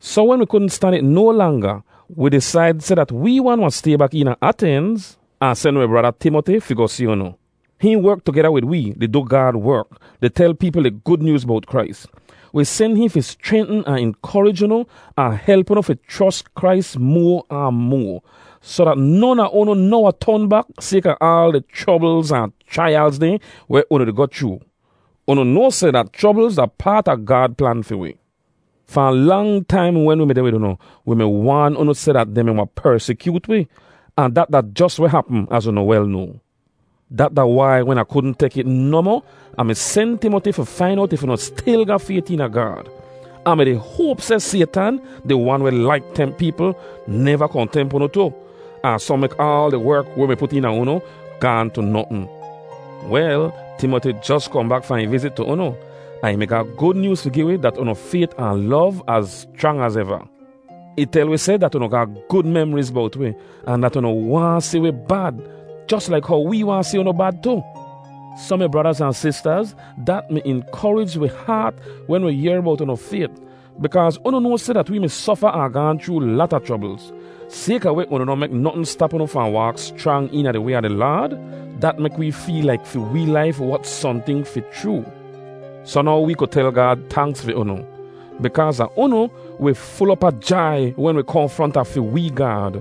Soh wen wi kudn stan it no langa, wi disaid seh dat wee wan wahn stay bak eena Atenz, ahn sen wi brada, Timoti, fi goh si unu. Hihn werk tugeda wid wee, di du Gaad werk, di tel peepl di Gud Nyooz bowt Krais. Wi sen hihn fi schrentn ahn inkorij unu ahn help unu fi chros Krais moa ahn moa, soh dat non a unu noh wahn ton bak sayka aal di chroblz ahn chraiyalz dehn weh unu di goh chroo. Unu noa seh dat chroblz da paat a Gaad plan fi wi. Fahn lang taim wen wi mi deh wid unu, wi mi waan unu seh dat dehn mi wahn persikyoot wi, ahn dat da jos weh hapm, az unu wel noa. Dat da wai wen Ah kudn tek it nohmoh, Ah mi sen Timoti fi fain owt if unu stil ga fayt eena Gaad. Ah mi-di hoap seh Saytan, di wan weh laik temp peepl, neva kohn temp unu tu, ahn soh mek aal di werk weh wi mi put eena unu gaahn tu notn. Wel, Timoti jos kohn bak fahn ih vizit tu unu, ahn ih mi ga gud nyooz fi gi wi dat unu fayt ahn lov az schrang az eva. Ih tel wi seh dat unu ga gud memriz bowt wi ahn dat unu waahn si wi bad, jos laik how wee waahn si unu bad tu. Soh, mi bradaz ahn sistaz, dat mi inkorij wi haat wen wi yehr bowt unu fayt bikaaz unu noa seh dat wee mi sofa ahn gaahn chroo lata chroblz. Sayka weh unu noh mek notn stap unu fahn waak schrang eena di way a di Laad, dat mek wee feel laik fi wee laif wot sohnting fi chroo. Soh now wee ku tel Gaad tanks fi unu. Bikaaz a unu, wi ful op a jai wen wi kohn fronta fi wee Gaad.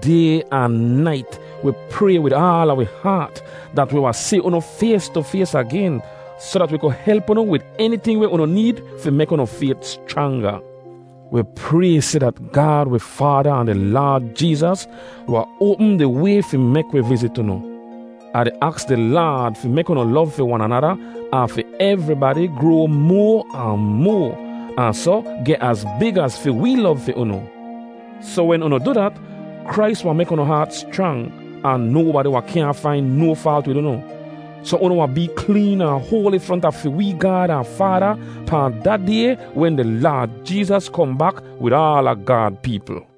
Day ahn nait wi pray wid aala wi haat dat wi wahn si unu fays tu fays agen soh dat wi ku help unu wid eniting weh unu need fi mek unu fayt schranga. Wi pray seh dat Gaad wi Faada ahn di Laad Jeezas wahn oapm di way fi mek wi vizit unu. Ah di aks di Laad fi mek unu lov fi wan anada ahn fi evribadi groa moa ahn moa, ahn soh geh az big az fi wee lov fi unu. Soh wen unu du dat, Krais wahn mek unu haat schrang, ahn nobadi wahn kyaahn fain no faalt wid unu, soh unu wahn bee kleen ahn hoali fronta fi wee Gaad ahn Faada pahn da Day wen di Laad Jeezas kohn bak wid aala Gaad peepl.